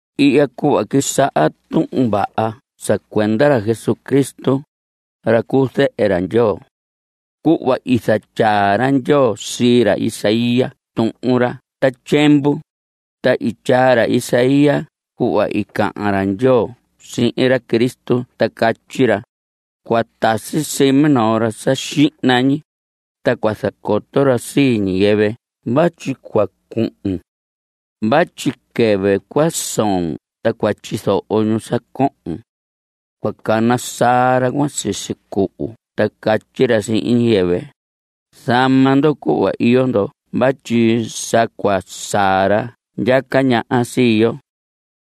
Ihya cuhva quisaha Tuhun Vaha sa cuenda ra Jesucristo, ra cu zehe Ndyoo. Cuhva i zatyaa ra Ndyoo sii ra Isaías tuhun ra ta tyiemvu, ta i tyaa ra Isaías cuhva i cahan ra Ndyoo sihin ra Cristo ta catyi ra: Cua tasi sii minoo ra sa xihna ñi, ta cua zacoto ra sii ñiyɨvɨ vatyi cua cuhun. Vatyi quɨvɨ cua soon ta cua tyizoho ñu sa cohon. Cua cana saa ra cuan sisi cuhu ta catyi ra sihin ñiyɨvɨ: “Zama ndo cuhva iyo ndo vatyi sa cua saa ra ndyaca ñaha sii yo.”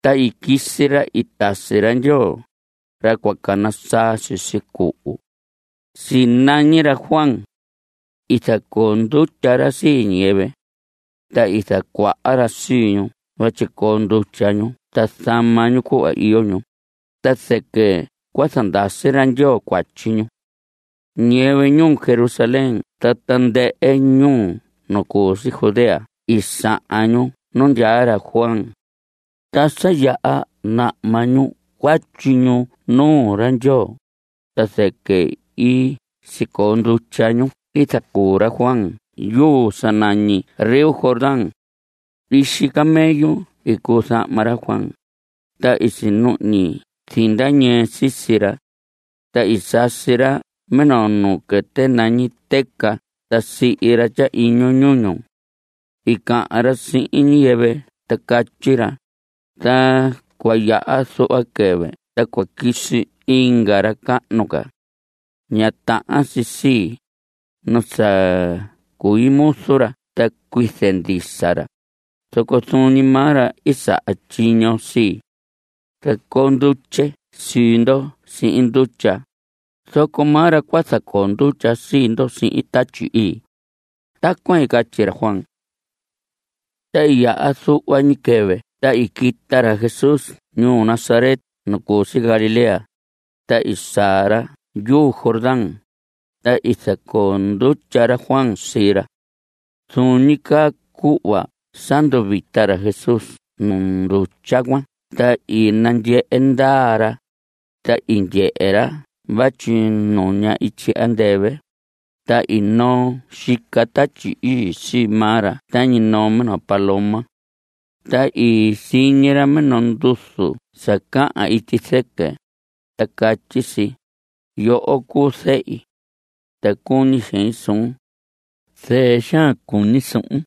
Ta i quisi ra i tasi ra Ndyoo, ra cua cana saa sisi cuhu. Sinañi ra Juan. I zacoo ndutya ra sii ñiyɨvɨ. Ta i zacuaha ra sii ñu vatyi coo ndutya ñu ta zama ñu cuhva iyo ñu, ta zɨquɨ cua zandasi ra Ndyoo cuatyi ñu. Ñiyɨvɨ ñuu Jerusalén ta tandɨhɨ ñuu nu cu si Judea i sahan ñu nu ndyaa ra Juan. Ta sa yaha nahma ñu cuatyi ñu nuu ra Ndyoo, ta zɨquɨ i sicoo ndutya ñu i zacuu ra Juan yuu sa nañi río Jordán. Ixi camello i cuu zahma ra Juan, ta i sinuhñi zinda ñɨɨ sisi ra. Ta i sasi ra minoo nuu quɨtɨ tañi tɨca ta sihi ra tyahiñu ñuñu. I cahan ra sihin ñiyɨvɨ ta catyi ra: Ta cua yaha zuhva quɨvɨ ta cua quisi inga ra cahnu ca. Ña tahan si sii, nu sa cui muzu ra ta cuize ndisa ra, zoco zuun ñi maa ra i saha tyiño sii. Zacoo ndutye sii ndo sihin ndutya, zoco maa ra cua zacoo ndutya sii ndo sihin Tatyi Ii. Tacuan i catyi ra Juan. Ta i yaha zuhva ñi quɨvɨ ta i quita ra Jesús ñuu Nazaret nu cu si Galilea, ta i saa ra yuu Jordán, ta i zacoo ndutya ra Juan sii ra. Zuun ñi caa cuhva sa nduvita ra Jesús nu ndutya cuan ta i nandyehe ndaa ra, ta i ndyehe ra vatyi nuña ityi andɨvɨ, ta i noo xica Tatyi Ii sii maa ra tañi noo minoo paloma. Ta i siñi ra minoo nduzu sa cahan ityi zɨquɨ, ta catyi si: Yoho cuu zehi. Ta cuñi xein suun. Zɨɨ xaan cuñi suhun.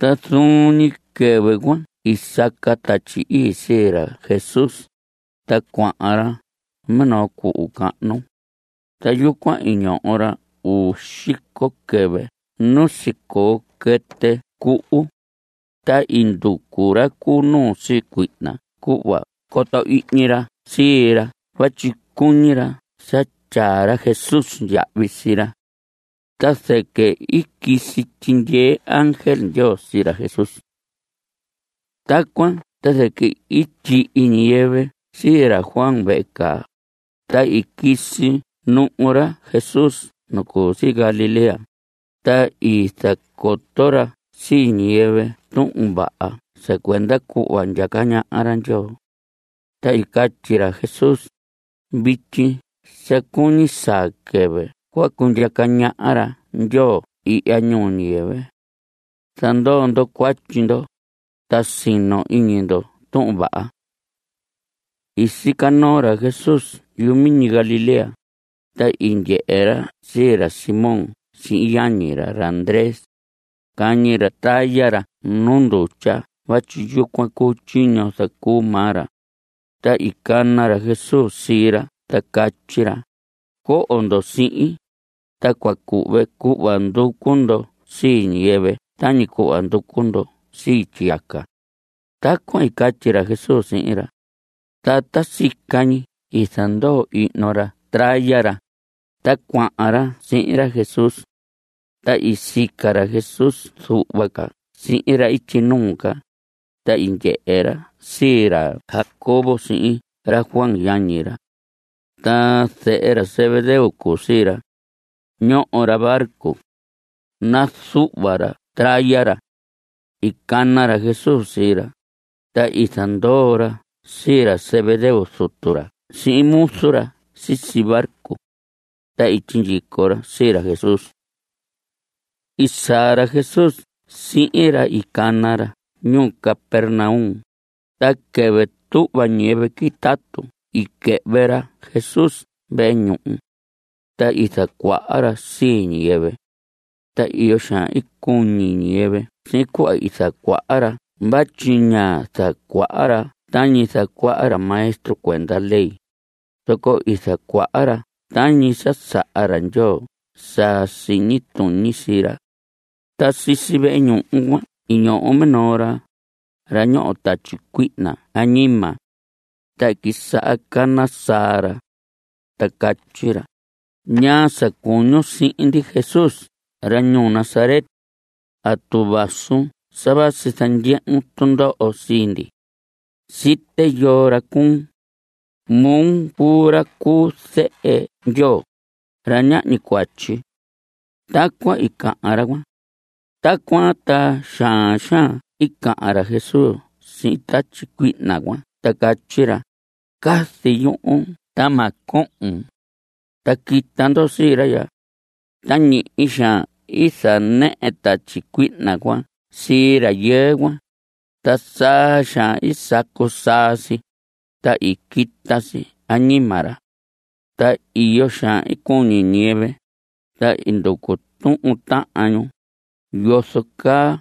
Ta zuun ñi quɨvɨ cuan i saca Tatyi Ii sii ra Jesús, ta cuahan ra minoo cuhu cahnu. Ta yucuan i ñoho ra uu xico quɨvɨ nu sicoo quɨtɨ cuhu. Ta i nducu ra cu nuu sii cuihna cuhva coto ihñi ra sii ra vatyi cuñi ra sa tyaa ra Jesús yahvi sii ra. Ta zɨquɨ i quisi tyindyee ángel Ndyoo sii ra Jesús. Tacuan ta zɨquɨ i tyihi ñiyɨvɨ sii ra Juan vehe caa, ta i quisi nuhu ra Jesús nu cu si Galilea, ta i zacoto ra sii ñiyɨvɨ Tuhun Vaha sa cuenda cuhva ndyaca ñaha ra Ndyoo. Ta i catyi ra Jesús: Vityi sa cuñi saa quɨvɨ cua cundyaca ñaha ra Ndyoo ihya ñuu ñiyɨvɨ. Zandoo ndo cuatyi ndo, ta sino iñi ndo Tuhun Vaha. I sica noo ra Jesús yumiñi Galilea, ta i ndyehe ra sii ra Simón sihin yañi ra, ra Andrés. Cañi ra traya ra nu ndutya vatyi yucuan cuu tyiño zacuu maa ra. Ta i cana ra Jesús sii ra ta catyi ra: Coho ndo sihin, ta cua cuhve cuhva nducu ndo sii ñiyɨvɨ tañi cuhva nducu ndo sii tyiyaca. Tacuan i catyi ra Jesús sihin ra. Ta ta sica ñi i zandoo ihno ra traya ra, ta cuahan ra sihin ra Jesús. Ta i sica ra Jesús zuhva ca sihin ra ityi nuu ca, ta i ndyehe ra sii ra Jacobo sihin ra Juan yañi ra. Ta zehe ra Zebedeo cuu sii ra. Ñoho ra barco. Nazuhva ra traya ra. I cana ra Jesús sii ra, ta i zandoo ra sii ra Zebedeo zutu ra sihin muzu ra sisi barco. Ta i sindyico ra sii ra Jesús. I saa ra Jesús sihin ra i cana ra ñuu Capernaum, ta quɨvɨ tuhva ñiyɨvɨ quitatu i quɨhvɨ ra Jesús vehe ñuhu. Ta i zacuaha ra sii ñiyɨvɨ. Ta iyo xaan i cuñi ñiyɨvɨ sihin cuhva i zacuaha ra vatyi ñá zacuaha ra tañi zacuaha ra maestro cuenda ley, zoco i zacuaha ra tañi sa saha ra Ndyoo sa siñi tuñi sii ra. Ta sisi vehe ñuhu cuan i ñoho minoo ra, ra ñoho tatyi cuihna añima. Ta i quisaha cana saa ra. Ta catyi ra: ¿Ñaa sa cuñun sihin ndi? Jesús, ra ñuu Nazaret. ¿Atu vasun sa vasi zandyehun tundoho sii ndi? Site yoo ra cuun. Moo cuu ra cu zehe Ndyoo, ra ñahñi cuatyi. Tacuan i cahan ra cuan. Tacuan ta xaan xaan i cahan ra Jesús sihin tatyi cuihna cuan ta catyi ra: Cazi yuhun ta ma cohon. Ta quita ndo sii ra ya. Ta ñihi xaan i zanɨhɨ tatyi cuihna cuan sii rayɨɨ cuan, ta saa xaan i sacu saa si, ta i quita si añima ra. Ta iyo xaan i cuñi ñiyɨvɨ, ta i nducu tuhun tahan ñu: ¿Yozo caa?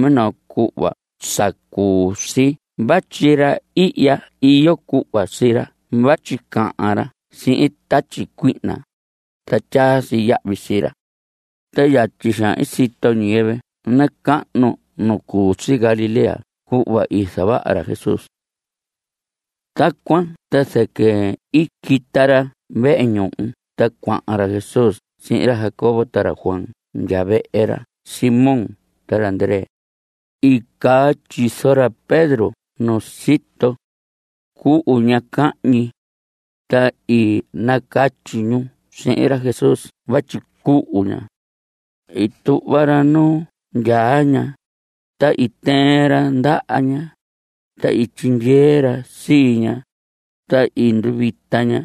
Minoo cuhva saa cuu si vatyi ra ihya iyo cuhva sii ra vatyi cahan ra sihin tatyi cuihna, ta tyaa si yahvi sii ra. Ta yatyi xaan i sito ñiyɨvɨ nacahnu nu cu si Galilea cuhva i zavaha ra Jesús. Tacuan ta zɨquɨ i quita ra vehe ñuhu ta cuahan ra Jesús sihin ra Jacobo ta ra Juan ndya vehe ra Simón ta ra Andrés. I caa tyizo ra Pedro nu sito. Cuhu ña cahñi. Ta i nacatyi ñu sihin ra Jesús vatyi cuhu ña. I tuhva ra nu ndyaa ña, ta i tɨɨn ra ndaha ña, ta i tyindyee ra sii ña, ta i nduvita ña.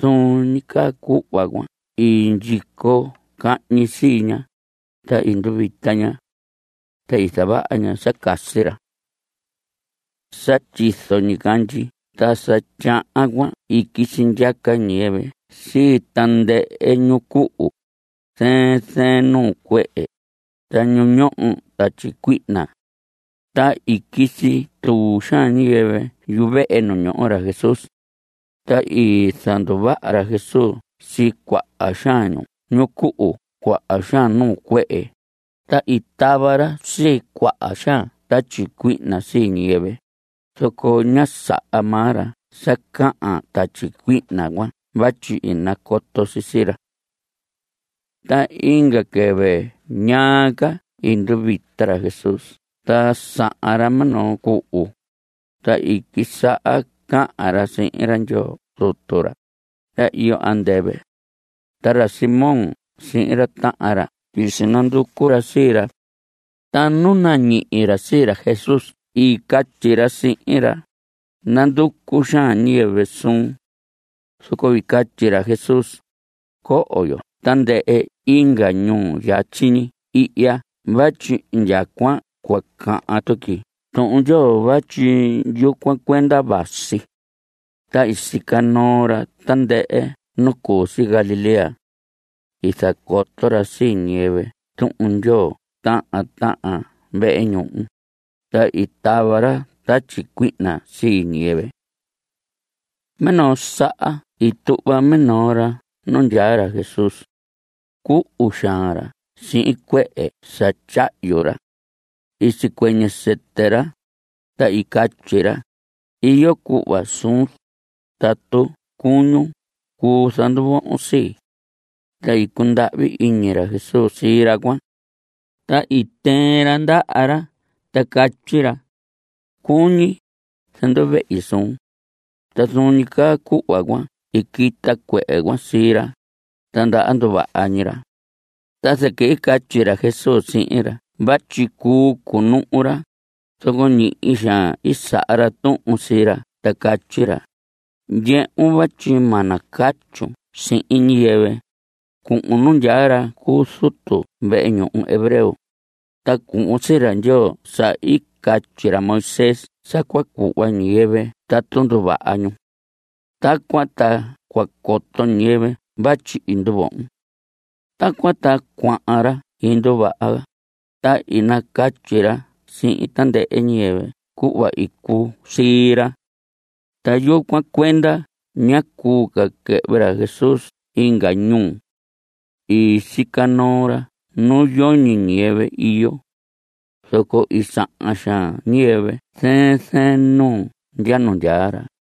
Zuun ñi caa cuhva cuan i ndyico cahñi sii ña, ta i nduvita ña. Ta i zavaha ña sa casi ra. Sa tyizo ñicandyi ta sa tyahan cuan i quisi ndyaca ñiyɨvɨ sii tandɨhɨ ñu cuhu, zɨɨn zɨɨn nuu cuehe, ta ñu ñoho tatyi cuihna. Ta i quisi tuu xaan ñiyɨvɨ yuvehe nu ñoho ra Jesús. Ta i zanduvaha ra Jesús sii cuaha xaan ñu cuhu cuaha xaan nuu cuehe, ta i tava ra sii cuaha xaan tatyi cuihna sii ñiyɨvɨ, zoco ñá saha maa ra sa cahan tatyi cuihna cuan vatyi i nacoto si sii ra. Ta inga quɨvɨ ñaa ca i nduvita ra Jesús ta sahan ra minoo cuhu, ta i quisaha cahan ra sihin ra Ndyoo Zutu ra, ra iyo andɨvɨ. Ta ra Simón sihin ra tahan ra i sinanducu ra sii ra. Ta nu nañihi ra sii ra Jesús i catyi ra sihin ra: Nanducu xaan ñiyɨvɨ suun. Zoco i catyi ra Jesús: Coho yo tandɨhɨ inga ñuu yatyi ñi ihya vatyi indyacuan cua cahan tuqui Tuhun Ndyoo vatyi yucuan cuenda vasi. Ta i sica noo ra tandɨhɨ nu cu si Galilea. I zacoto ra sii ñiyɨvɨ Tuhun Ndyoo tahan tahan vehe ñuhu, ta i tava ra tatyi cuihna sii ñiyɨvɨ. Minoo saha i tuhva minoo ra nu ndyaa ra Jesús. Cuhu xaan ra sihin cuehe sa tyahyu ra. I sicuɨñɨ sɨtɨ ra, ta i catyi ra: Iyo cuhva suun, tatu cuñun cuu zanduvohon sii. Ta i cundahvi iñi ra Jesús sii ra cuan, ta i tɨɨn ra ndaha ra ta catyi ra: Cuñi. Zanduvehi suun. Ta zuun ñi caa cuhva cuan i quita cuehe cuan sii ra, ta ndaha nduvaha ñi ra. Ta zɨquɨ i catyi ra Jesús sihin ra vatyi cuu cunuhu ra, zoco ñihi xaan i saha ra tuhun sii ra ta catyi ra: Ndyehun, vatyi ma nacatyun sihin ñiyɨvɨ. Cuhun nu ndyaa ra cu zutu vehe ñuhu hebreo, ta cuhvon sii ra Ndyoo sa i catyi ra Moisés sa cua cuhva ñiyɨvɨ tatu nduvaha ñu. Tacuan ta cua coto ñiyɨvɨ vatyi i nduvohon. Tacuan ta cuahan ra i nduvaha, ta i nacatyi ra sihin tandɨhɨ ñiyɨvɨ cuhva i cuu sii ra. Ta yucuan cuenda ñá cuu ca quɨhvɨ ra Jesús inga ñuu. I sica noo ra nu yoñi ñiyɨvɨ iyo. Zoco i sahan xaan ñiyɨvɨ zɨɨn zɨɨn ñuu ndya nu ndyaa ra.